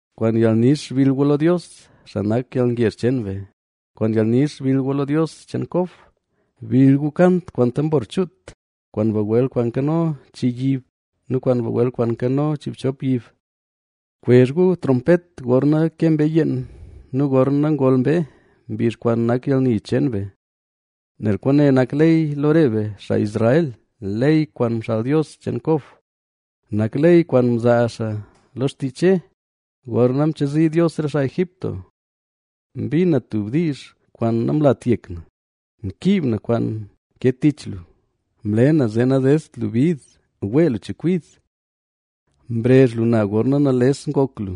Kwaan yalnix bill gu lo Dios, xaa nak yalngezh cheen be, ¡Kwaan yalnix bill gu lo Dios cheen Kob! Bill gu kant kwaan tambor chuut, kwaan bagwel kwaan nkano chii yib nu kwaan bagwel kwaan nkano chiibchop yib. Kwezh gu trompet gorna ke mbee yeen nu gorna ngol mbee, mbizh kwaan nak yalni cheen be. Nel kwaane nak ley lo re be, xaa Israel, ley kwaan mxaal Dios cheen Kob, Nak ley kwaan mzaa xaa lo xtii Che, gorna mchazi Dios re xaa Egipto. Mbin na tub diizh kwaan namlat yek na: “Mkiib na kwaan nke tich lu, mle na zee nadedt lu bid wee lu chekwid. Mrezh lu na gorna nales ngok lu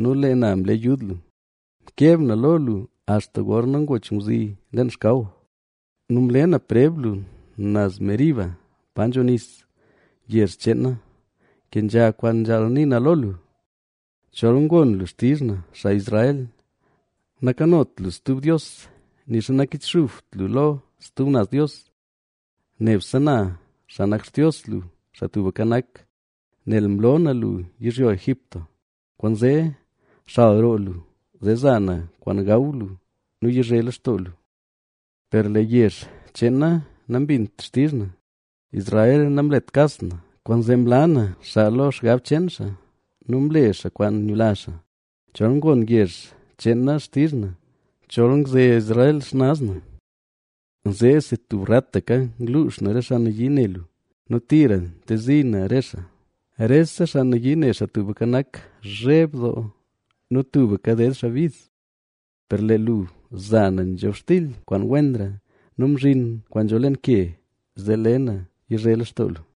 nu lee na mle yud lua; mkeb na lo lu axta gorna ngoch ngwzi leen xkaw; nu mle na preb lu naz Meribab pa nzho nis. Yezh cheen na, kenzha kwaan nzhaal nii na lo lu. ¡Chol ngon lu xtizh na, xaa Israel! Nakanot lu stub dios, Nixa nakichxubt lu lo stub naz dios. Nebse na, xaa nak Xtios lu, Xaa Tubka Nak, nel mlo na lu yizhyo Egipto, kwaanzee xal roo lu, zee za na kwaan gaw lu nu yizhe lextoo lu. Per lee yezh cheen na nambint xtizh na, Israel namlet kas na. Kwaanzee mla na xaa lo xgab cheen xaa nu mle xaa kwaan nyula xaa. ¡Chol ngon yezh cheen na xtizh na! ¡Chol ngze Israel xnaz na! Zeesi tub rataka ngluux na re xaa nayii ne lu nu tira ngtezi na re xaa. Rese xaa nayii ne Xaa Tubka Nak zheb doo nu tubka ded xaa bid. Per lee lo lu za na nzhobxtil kwaan wenra, nu mzhin kwaan nzho leen ke, zee le na yizhe lextoo lu.”